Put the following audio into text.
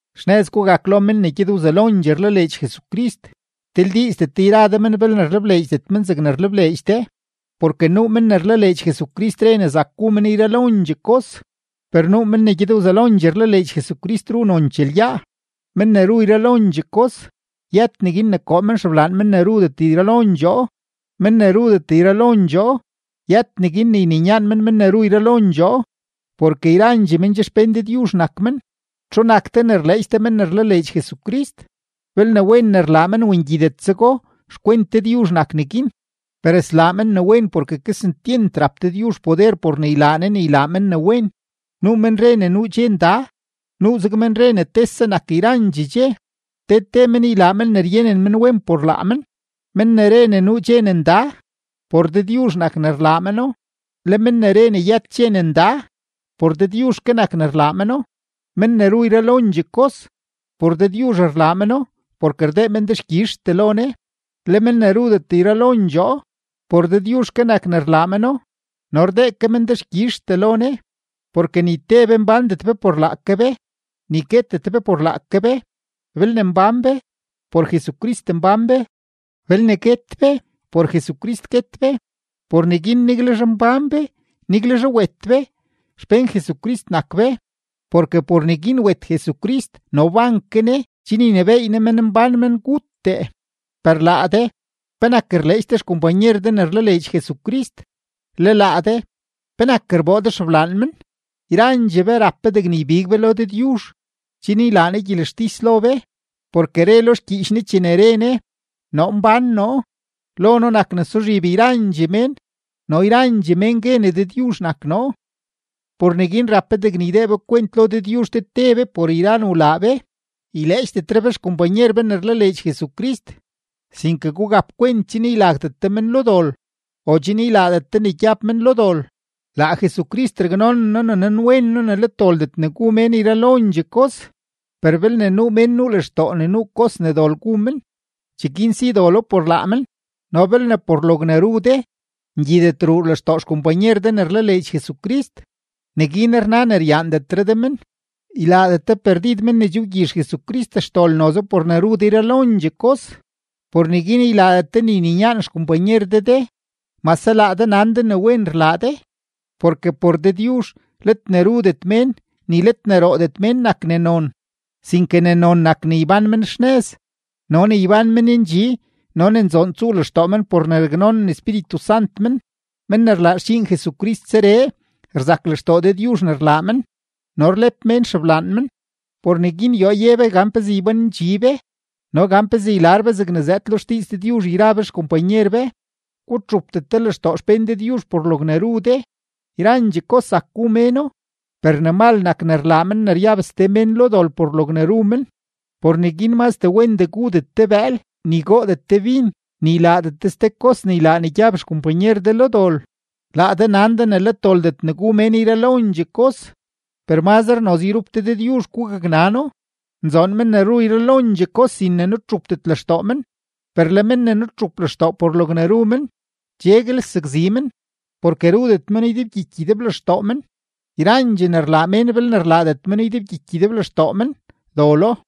Xnëz gugak lo men ne gyed wzelondxee rlaleedx Jesucrist, tildiizdet de yra de men belne rlebleedxdet men zegne rlebleedx de. Porke nuu men ne rlaleedx Jesucrist re ne zak gu men yralondxee kos, per nuu men ne gyed wzelondxee rlaleedx Jesucrist ru nonchee lyaa. Men ne ru yralondxee kos, yët neguin ne koo men xeblaan men ne rudet yralondxoo; men ne rudet yralondxoo, yët neguin ne yninyaan men men ne ru yralondxoo, porke yrandxee men che xpén Dëdyuzh nak men. ¿Txu nak de ne rleedx de men ne rlaleedx Jesucrist? Belne wen ne rlaa men o ngyidetzego, xkwent Dëdyuzh nak neguin. Per slaa men ne wen porke kesentyent rap Dëdyuzh poder por ne ylaa Ne ne ylaa men ne wen. Nuu men re ne nuu dxe nda, nuuzeg men re ne tese nak yrandxee dxe. Te te men ylaa men ne ryenen men wen por laa men. Men ne re ne nuu dxe ne nda, por Dëdyuzh nak ne rlaa meno; le men ne re ne yët dxe ne nda, por Dëdyuzh ke nak ne rlaa meno; men ne ru yralondxee kos, por Dëdyuzh rlaa meno porke rdee men dexkyizhtee lo Ne; le men ne rudet yralondxoo, por Dëdyuzh ke nak ne rlaa meno no rdee ke men dexkyizhtee lo Ne. Porke ni te be mbándet be por laake be, ni guetet be por laake be. Belne mbán be, por Jesucrist mbán be; belne guet be, por Jesucrist guet be. Por neguin niguelzhe mbán be, niguelzhe wet be, xpén Jesucrist nak be. Porke por neguin wet Jesucrist no wban ke Ne chen ynebééy Ne menmbán menguttee. Per laa de, ¿penak rleedx de xkompanyer de ne rlaleedx Jesucrist? Le laa de, ¿penak rboo de xeblaan men? Yrandxee be rap be degne ybig be lo Dëdyuzh, chen ylaa Ne gyelextis lo be. Porke re lo xgyiich Ne chene re Ne: Noo mbán noo. Lo noo nak ne suzhib yrandxee mén no yrandxee mén gue ne Dëdyuzh nak noo. Por neguin rap be degne ydee be kwent lo Dëdyuzh te te be por yra ne wlaa be. Yleedxdetre de xkompanyer de ne rlaleedx Jesucrist, sinke gugap kwent chen ylagdet de men lo dol o chen ylaadet de ne gyab men lo dol. Laa Jesucrist raknonen noo ne nanwen noo ne let doldet ne gu mén yralondxee kos, per belne nuu mén nuu lextoo ne nuu kos ne dol gu men, cheguin si dolo por laa men. No belne por logne ru de, ngyidet ruu lextoo xkompanyer de ne rlaleedx Jesucrist, neguin rna ne ryaandetre de men. Ylaadet de perdid men ne che wgyizh Jesucrist xdol noze por ne ru de yralondxee kos. Por neguin ylaadet de ne yninyaan xkompanyer de de, mase laa de nan ne wen rlaa de. Porke por Dëdyuzh, let ne rudet mén ni let ne roodet mén nak ne non, sinke ne non nak ne ybán men xnëz no ne ybán men ndxi no ne nzoon tsuu lextoo men por ne raknonen Espíritu Sant men. Men ne rlaa xdxiin Jesucrist zeree, rzak lextoo Dëdyuzh ne rlaa men no rlep mén xeblaan men. Por neguin yoo ye be gan pezee ybánendxi be no gan pezee ylar be zegne zëëd lo xdiiz Dëdyuzh yra be xkompanyer be. Gutxupdet de lextoo xpén Dëdyuzh por logne ru de. Yrandxee kos zak gu méno, per ne mal nak ne rlaa men ne ryab ste mén lo dol por logne ru men. Por neguin mazre wendee gudet de bëël, ni goodet de bin, ni ylaadet de ste kos ne ylaa ne gyab xkompanyer de lo dol. Laa de nan de ne let doldet ne gu mén yralondxee kos, per mazre noze yrup de Dëdyuzh gugaknano. ¡Nzoon men ne ru yralondxee kos sin ne nutxupdet lextoo men! Per le men ne nutxup lextoo por logne ru men, cheguel sakzi men, porke rudet meno ydebgyiky ydeblextoo men; yrandxee ne rlaa mén belne rlaadet meno ydebgyiky ydeblextoo men, dolo.